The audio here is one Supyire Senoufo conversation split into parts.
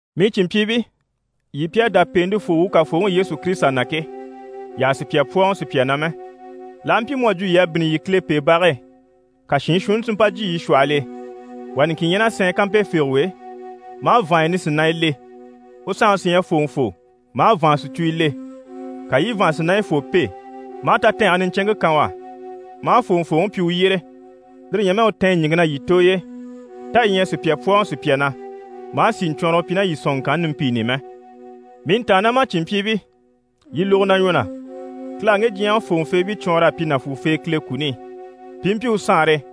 Mii cìnmpyiibii, yii pi à dá pèentefoo wuu Kafooŋi Yesu Kirisita na ke, yii àha sùpya pwɔ́ɔŋɔ sùpya na mɛ. L'aha mpyi mu à jwo yii à bínni yii Kilepeebage e, ka shiin shuunni si mpa jyè yii shwɔhɔl'e, wà niŋkin ɲyɛ ná sɛɛn kampefegewe e, maa vàanya nisinanya le, u sanŋi sí ɲyɛ fòŋɔfoo, maa vàansicuyo le. Ka yii i vàansinayifoo pêe, maa tatɛɛnge niɲcɛnŋke kan u á, maa fòŋɔfooŋi pyi u yyére, lire ɲyɛ mɛ u tɛ̀ɛn ɲìŋke na yii tooy'e. Tá yii ɲyɛ a sùpya pwɔ́ɔŋɔ sùpya na, maa sìɲcwɔɔnrɔgɔ pyi ná yii sɔ̀nŋɔŋkanni nimpiini i mɛ? Mii ntàannamacinmpyiibii, yii lógo na ɲwɔ na: Kile à ŋge diɲyɛŋi fòŋɔfeebii cwɔɔnr'a pyi nàfuufee Kile kuni i, pi i mpyi u Saanre e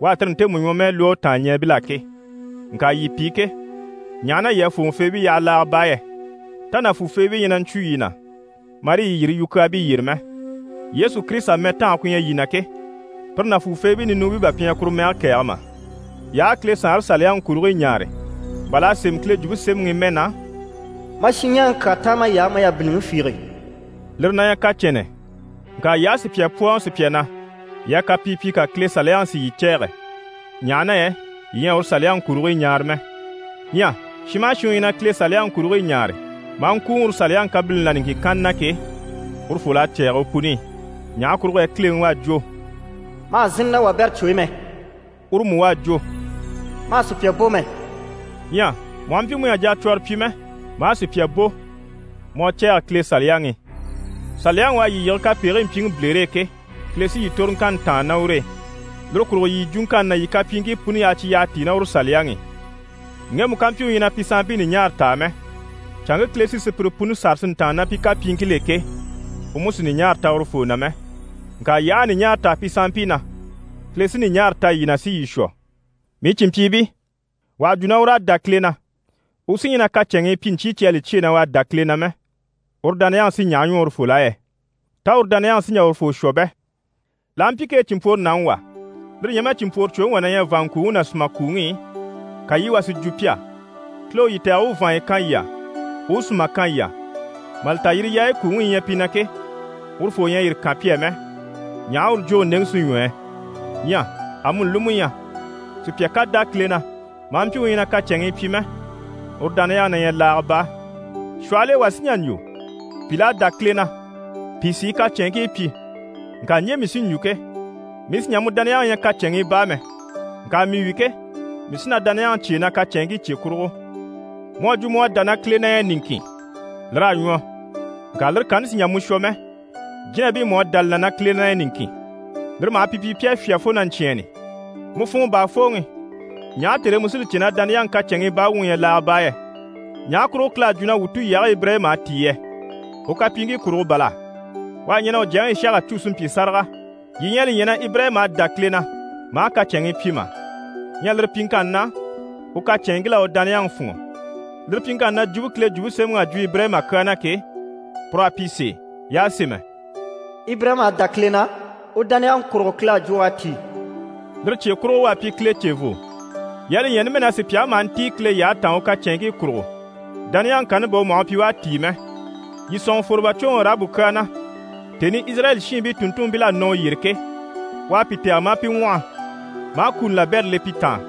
u à tire ntemu ɲwɔmɛɛ lwɔ́ u tàanɲɛɛbil'á ke. Ŋka yii pi ke, ɲaha na yii à fòŋɔfeebii yaha laaga baa yɛ? Tá nàfuufeebii ɲyɛ na ɲcwu yii na, marii yii yiri yukyaabii yyére mɛ? Yesu Kirisita mɛtange ku ɲyɛ yii na ke, pire nàfuufeebii ninuubii bà pi ɲyɛ na kuru mɛge kɛ̀ɛge mà? Yii aha a Kile SaanreSaliyaŋi kurigii ɲaare, bà l'à sémɛ Kile Jwumpe Semɛŋi i mɛ na: «Ma shinɲɛɛŋi kyaa táan may'á, ma yabiliŋi fiige» lire na ɲyɛ kyaa niɲcɛnnɛ. Ŋka yii aha sùpya pwɔ́ɔŋɔ sùpya na, yii à kapii pyi, ka Kile Saliyaŋi si yii cɛ̂ɛgɛ, ɲaha na yɛ yii ɲyɛ a uru Saliyaŋi kurigii ɲaare mɛ. Ɲyɛ shin maha shin u ɲyɛ na Kile Saliyaŋi kurigii ɲaare, maa ŋkùuŋɔ uru Saliyaŋi kabilini là niŋkin kanna na ke, urufol'à cɛ̂ɛgɛ u puni i. Ɲaha kurugo yɛ Kileŋi u à jwo: «Ma hà zínni ná wabɛrɛ cwo e mɛ» uru mú u à jwo: «Ma hà sùpya bò mɛ.» Ɲyɛ mu aha mpyi mu ɲyɛ a jacwɔrɔ pyi mɛ, maa sùpya bò, mu à cɛ̂ɛgɛ Kile Saliyaŋi i. Saliyaŋi u à yii yige kapegigii mpyiŋi bilere e ke, Kile sí yii toroŋkanni tàanna ná ur'e. Lire kurugo yii yii jwuŋkanni ná yii kapyiiŋkii puni yaha cyi yyaha tíi ná uru Saliyaŋi i. Ŋgemu ká mpyi u ɲyɛ a pi sanmpii ɲùɲaara ta mɛ, canŋke Kile sí sùpyire puni sâra si ntàanna ná pi kapyiiŋkil'e ke, u mú sì ɲùɲaara ta urufoo na mɛ. Ŋka yii aha ɲùɲaara ta pi sanmpii na, Kile sí ɲùɲaara ta yii na si yii shwɔ. Mii cìnmpyiibii, wà ha jwo na ur'à dá Kile na, u sí ɲyɛ na kacɛnŋii pyi, ɲcyii cyi à li cyêe na u à dá Kile na mɛ, uru dániyaŋi sí ɲaha ɲwɔ urufol'á yɛ? Tá uru dániyaŋi sí n‑jà urufoo shwɔ bɛ? L'aha mpyi kee cìnmpworonaŋi wà, lire ɲyɛ mɛ cìnmpworocwoŋi wà na ɲyɛ vàanŋkuuŋi ná sùmakuuŋi i, ka yii wà si jwo pi á: «Kile u yii tɛ̀gɛ, u u vàanya kan yii á, u u sùma kan yii á» mà li ta yaayi kuuŋi yi ɲyɛ pi na ke, urufoo ɲyɛ a yire kan pi á mɛ, ɲaha uru jwóŋi ndeŋi sí ɲwɔ yɛ? Ɲyɛ amuni li mú ɲyɛ sùpya ká dá Kile na, maa mpyi u ɲyɛ na kacɛnŋii pyi mɛ, uru dániyaŋi na ɲyɛ laaga baa. Shwɔhɔl'e wà sí n‑jà n‑jwo: «Pìl'à dá Kile na, pìi sí i kacɛnŋkii pyi.» Ŋka ɲje mii sí n‑jwo ke: «Mii sì n‑jà mu dániyaŋi ɲya kacɛnŋii baa mɛ. Ŋka mii wi ke, mii sí na dániyaŋi cyêe na kacɛnŋkii cye kurugo.» Mu à jwo na mu à dá na Kile na ɲyɛ niŋkin, lir'à ɲwɔ. Ŋka lire kanni sì n‑jà mu shwɔ mɛ. Jínabii mú à dá li na na Kile na ɲyɛ niŋkin, lire maha pi pyi pi à fyá fo na ɲcyɛ̂ɛnni. Mu funŋɔ baafooŋi, ɲaha tère e mu sí li cè na dániyaŋi kacɛnŋii baa wuŋi ɲyɛ laaga baa yɛ? Ɲaha kurugo Kile à jwo na wuu tulyage Ibirayima à tíi yɛ? U kapyiiŋkii kurugo bàl'à? U à ɲɛn'a u jyaŋi Ishaka cû si mpyi sáraga. Yii ɲyɛ a li ɲya na Ibirayima a dá Kile na, maa kacɛnŋii pyi mà? Ɲyɛ lire pyiŋkanni na, u kacɛnŋkil'à u dániyaŋi fûnŋɔ. Lire pyiŋkanni na, jwumpe Kile Jwumpe Semɛŋi à jwo Ibirayima kyaa na ke, pur'à pyi sèe. Y'à sémɛ: «Ibirayima à dá Kile na, u dániyaŋi kurugo, Kile à jwo u à tíi.» Lire cye kurugo, u à pyi Kile cevoo. Yii à li ɲya numɛ na sùpyaŋi maha ntíi Kile yyahe taan u kacɛnŋkii kurugo, dániyaŋi kanni bà u maha u pyi u à tíi mɛ. Yii sɔ̂nŋɔ fwòrobacwoŋi Arahabu kyaa na. Tèni i Izirayɛli shiinbii tùnntunmpil'à nɔ u yyére ke, u à pi tɛ̀gɛ, maa pi ŋwɔhɔ, maa kuni labɛrɛ le pi taan,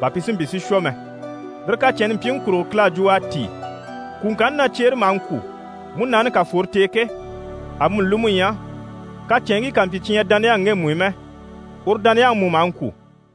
bà pi si mpyi si shwɔ mɛ. Lire kacɛnni mpyiŋi kurugo, Kile à jwo u à tíi. Kwùŋkanni na cyeere maha ŋkwû, múnaani ká fworo t'e ke, amuni li mú ɲyɛ, kacɛnŋkii ká mpyi cyi ɲyɛ dániyaŋi ŋgemu i mɛ, uru dániyaŋi mú maha ŋkwû.